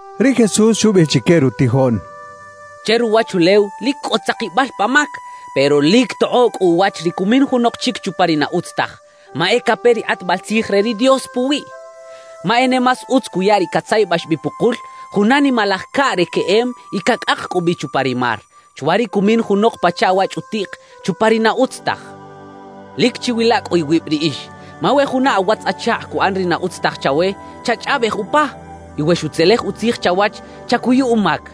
Ri Jesús xubiꞌij chique rutijoꞌn: «Che ruwachulew lic cꞌo tzakibal pa mac, pero ¡lic tokꞌoꞌ cꞌu uwach ri cumin junok chic chupa ri na utz taj, ma e cape ri kꞌatbal tzij re ri Dios puwiꞌ! Ma e ne más utz cuya ri catzayabax bi pukul juna nimalaj caꞌ re queꞌem y cacꞌak cꞌu bi chupa ri mar, chwa ri cumin junok pachaꞌ wa chꞌutiꞌk chupa ri na utz taj. »Lic chiwila cꞌu iwib riꞌix. Ma we juna awatz-achakꞌ cuꞌan ri na utz taj chawe, chachꞌaꞌbej upa. Y we xutzelej utzij chawach, chacuyu umac.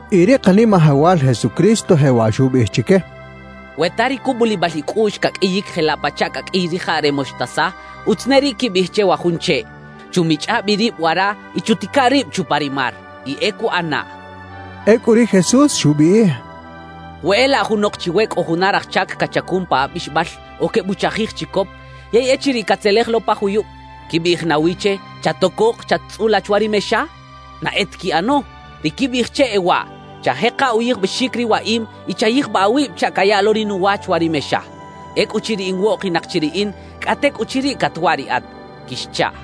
Y ri Kanimajawal Jesucristo jewaꞌ xubiꞌij chique: —We ta ri cubulibal icꞌuꞌx caqꞌuiyic jelaꞌ pachaꞌ caqꞌuiy rijaꞌ re moxtasa, utz ne riꞌ quibiꞌij che wa jun cheꞌ: “Chumichꞌa bi rib wara y chutica rib chupa ri mar,” y e cuꞌanaꞌ —xchaꞌ. Ecꞌu ri Jesús xubiꞌij: «We e laꞌ junok chiwe cꞌo juna raj chac cachacun pa abixbal o quebuchajij chicop, yey echiriꞌ catzelej lo pa juyub, ¿quibiꞌij nawi che: “Chatocok, chat-tzꞌula chwa ri mexa”? ¡Na e ta quiꞌano! Ri quibiꞌij che e waꞌ: “Chajeka uyijbaxic ri waꞌim y chayijbaꞌ awib chaꞌ caya lo ri nuwa chwa ri mexa. Ecꞌuchiriꞌ in woꞌkinak chi riꞌin, cꞌa tecꞌuchiriꞌ catwaꞌ riꞌat” quixchaꞌ.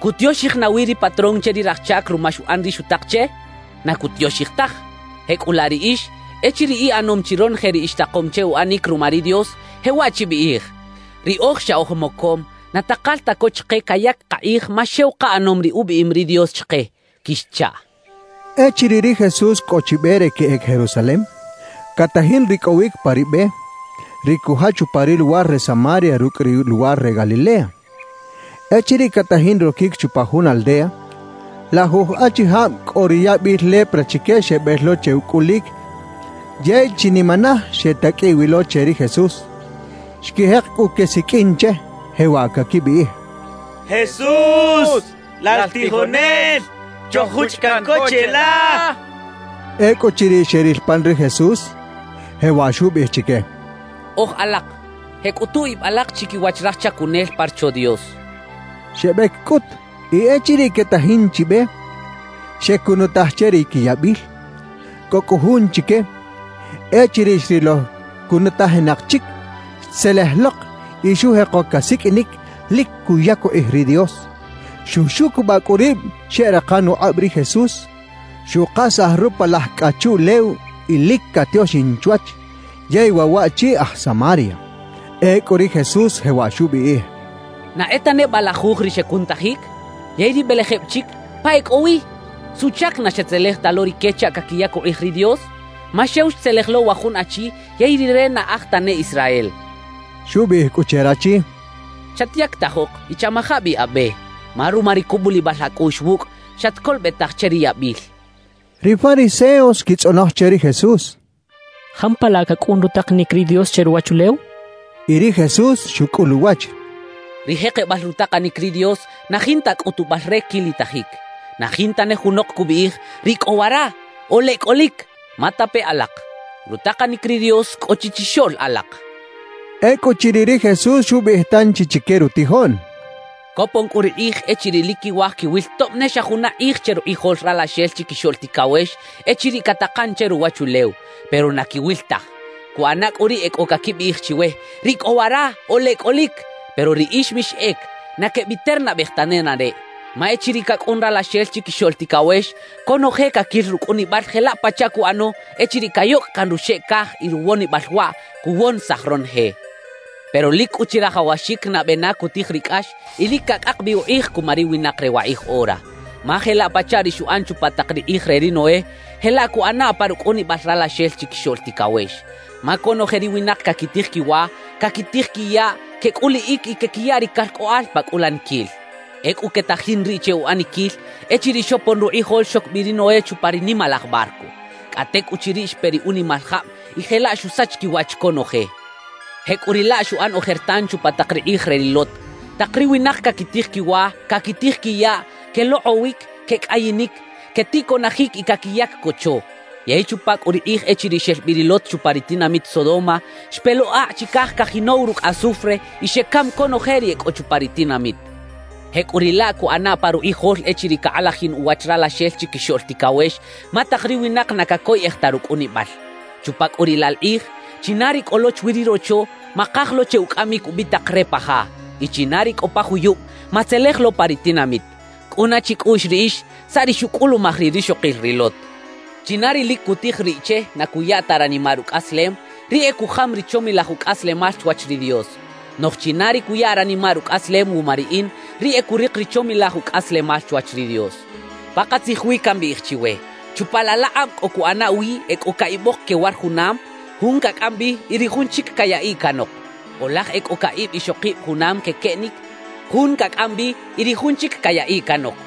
¿Cutioxij nawi ri patrón che ri raj chac ruma xuꞌan ri xutak che? Na cutioxij taj. Jecꞌulaꞌ riꞌix, echiriꞌ iꞌanom chi ronoje ri ixtakom che uꞌanic ruma ri Dios, jewaꞌ chibiꞌij: “Riꞌoj xa oj mocom, na takal ta co chike cayac kakꞌij ma xew kaꞌanom ri ubiꞌim ri Dios chike” quixchaꞌ.» Echiriꞌ ri Jesús cꞌo chi be re queꞌec Jerusalem, catajin ricꞌowic pa ri be, ri cujach upa ri luwar re Samaria rucꞌ ri luwar re Galilea. Echiriꞌ catajin roquic chupa jun aldea, lajuj achijab cꞌo ri yabil lepra chique xebel lo che ucꞌulic yey chinimanaj xetaqꞌuiꞌ wi lo che ri Jesús. Xquijek cꞌu quesiqꞌuin che, jewaꞌ caquibiꞌij: —¡Jesús, lal tijonel, choj-juchꞌ caꞌn co cheꞌla! —quechaꞌ. Ecꞌuchiriꞌ xeril pan ri Jesús, jewaꞌ xubiꞌij chique: —Oj alak, jeꞌcꞌutu ib alak chiquiwach raj chacunel pa Rocho Dios —xcha chique. Xebec cꞌut, y echiriꞌ quetajin chi be, xecunutaj che ri quiyabil. Cꞌo cꞌu jun chique, echiriꞌ xrilo cunutajinak chic, xtzelej lok y xujeko casiqꞌuinic, lic cuyac ukꞌij ri Dios. Xuxucubaꞌ cꞌu rib xeꞌrakan ukꞌab ri Jesús, xukasaj rupalaj cꞌa chuꞌlew y lic catioxin chwach, yey waꞌ waꞌchi aj Samaria. Ecꞌu ri Jesús jewaꞌ xubiꞌij: —¿Na e ta neba lajuj ri xecunutajic? Yey ri belejeb chic, ¿pa e cꞌo wi? ¿Suꞌchac na xetzelej ta lo rique chaꞌ caquiyac ukꞌij ri Dios? Ma xew xtzelej lo wa jun achi yey rire na aj tane Israel —xchaꞌ. Xubiꞌij cꞌu che rachi: —Chatyactajok y chamaja bi abe. Ma ruma ri cubulibal acꞌuꞌx wucꞌ, xatcolobetaj che ri yabil —xchaꞌ. Ri fariseos xquitzꞌonoj che ri Jesús: —¿Jampalaꞌ cacꞌun rutakanic ri Dios che ruwachulew? —xechaꞌ. Y ri Jesús xucꞌul uwach: —Ri jekebal rutakanic ri Dios na jinta cꞌutubal re quilitajic. Na jinta ne junok cubiꞌij: “¡Riꞌ cꞌo wara!” o “¡Leꞌ cꞌolic!” Ma tape alak: Rutakanic ri Dios cꞌo chi chixoꞌl alak —xcha chique. Ecꞌuchiriꞌ ri Jesús xubiꞌij tanchi chique rutijoꞌn: «Copon cꞌu ri kꞌij echiriꞌ lic quiwaj quiwil tob ne xa juna kꞌij che rukꞌijol Ralaxel Chiquixoꞌl Ticawex echiriꞌ catakan che ruwachulew; pero na quiwil taj. Cuꞌana cꞌu riꞌ e cꞌo caquibiꞌij chiwe: “¡Riꞌ cꞌo wara!” o “¡Leꞌ cꞌolic!” Pero riꞌix mixꞌec, na quebiternabej ta nenareꞌ. Ma echiriꞌ cacꞌun Ralaxel Chiquixoꞌl Ticawex, conoje caquil rucꞌunibal jelaꞌ pachaꞌ cuꞌano echiriꞌ cayocꞌ caꞌn ruxeꞌ caj y ruwonibal waꞌ cuwonisaj ronoje. Pero lic cꞌu chirajawaxic nabe na cutij ri cꞌax y lic cacꞌak bi ukꞌij cuma ri winak re wakꞌij ora. »Ma jelaꞌ pachaꞌ ri xuꞌan chupa tak ri kꞌij re ri Noé, jelaꞌ cuꞌana pa rucꞌunibal Ralaxel Chiquixoꞌl Ticawex. Ma conoje ri winak caquitij quiwa, caquitij quiyaꞌ, quecꞌuliꞌic y quequiya ri calcꞌoꞌal pa cꞌulaniquil. Ecꞌu quetajin riꞌ che uꞌaniquil, echiriꞌ xopon rukꞌijol xoc bi ri Noé chupa ri nimalaj barco; cꞌa tecꞌuchiriꞌ xpe ri unimal jab y jelaꞌ xusach quiwach conoje. Jecꞌuriꞌlaꞌ xuꞌan ojertan chupa tak ri kꞌij re ri Lot: tak ri winak caquitij quiwa, caquitij quiyaꞌ, quelokꞌowic, quecꞌayinic, queticoꞌnajic y caquiyac cocho. Yey chupa cꞌu ri kꞌij echiriꞌ xel bi ri Lot chupa ri tinamit Sodoma, xpe lo akꞌ chicaj cajinow rucꞌ azufre y xecam conoje ri e cꞌo chupa ri tinamit. Jecꞌuriꞌlaꞌ cuꞌana pa rukꞌijol echiriꞌ cakꞌalajin uwach Ralaxel Chiquixoꞌl Ticawex, ma tak ri winak na cacoyꞌej ta rucꞌunibal. »Chupa cꞌu riꞌ la kꞌij, china ri cꞌo lo chwi ri rocho, makaj lo che ucꞌamic ubitak re pa ja; y china ri cꞌo pa juyub, matzelej lo pa ri tinamit. Cꞌuna chicꞌuꞌx riꞌix saꞌ ri xucꞌulumaj ri rixokil ri Lot. China ri lic cutij riꞌ che na cuya ta ranimaꞌ rucꞌaslem, riꞌ e cujam ri chomilaj ucꞌaslemal chwach ri Dios; noꞌj china ri cuya ranimaꞌ rucꞌaslem wuma riꞌin, riꞌ e curik ri chomilaj ucꞌaslemal chwach ri Dios. »Pakatzij wi cambiꞌij chiwe: Chupa laꞌ laꞌkꞌab cꞌo cuꞌana wi e cꞌo caꞌibok quewar junam; jun cacꞌam bi y ri jun chic cayaꞌiꞌ canok. O laj e cꞌo caꞌib ixokib junam quequeꞌnic; jun cacꞌam bi y ri jun chic cayaꞌiꞌ canok.